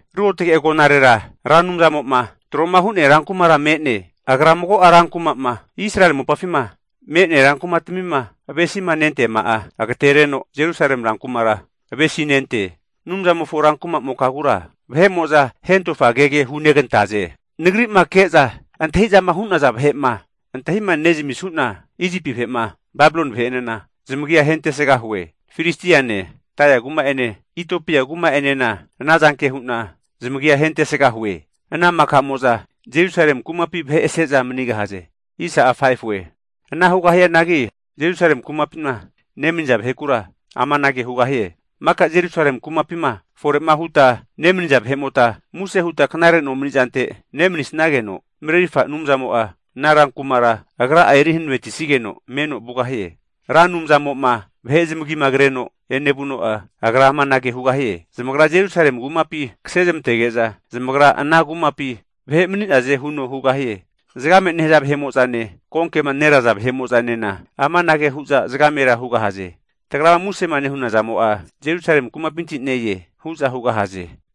Ruotge agonarera Ra Anumzamo'ma tro'ma hu'nea rankumara me'ne. Agra mago'a rankuma'ma Israeli mopafima me'nea rankumatmima avesima nenteama'a agatereno Jerusalemi rankumara avesinente. Anumzamofo rankuma'mokagura vahe'mo'za hentofa kege hunegantaze. Nagri'ma ke'za antahi'zama hu'naza vahe'ma antahima nezamisuna, Isipi vahe'ma Babiloni vahe'enena zamagia ahentesgahue. Filistiane Tairi kuma'ene Itiopia kuma'enena ana zanke hu'na zamagia ahentesgahue. Ana maka'mo'za Jerusalemi kumapi vahe ase'za manigahaze! Ana hugahianagi Jerusalemi kumapima nemaniza vahekura amanage hugahie, maka Jerusalemi kumapima fore'ma huta nemaniza vahe'mota, muse huta knare nomani'zante nemanisageno, Marerirfa Anumzamo'a ana rankumara Agra'a eri hanavetisigeno meno vugahie. Ra Anumzamo'ma vahe zamagima kreno evanuno'a Agra amanage hugahie, zamagra Jerusalemi kumapi kasezmantege'za, zamagra ana kumapi vahe mani'naze huno hugahie. Zgame nehaza vahe'mo'zane konkema neraza vahe'mo'zanena amanage hu'za zagamera hugahaze, Tagrama musema nehuna zamo'a, Jerusalemi kumapinti ne-e, hu'za hugahaze.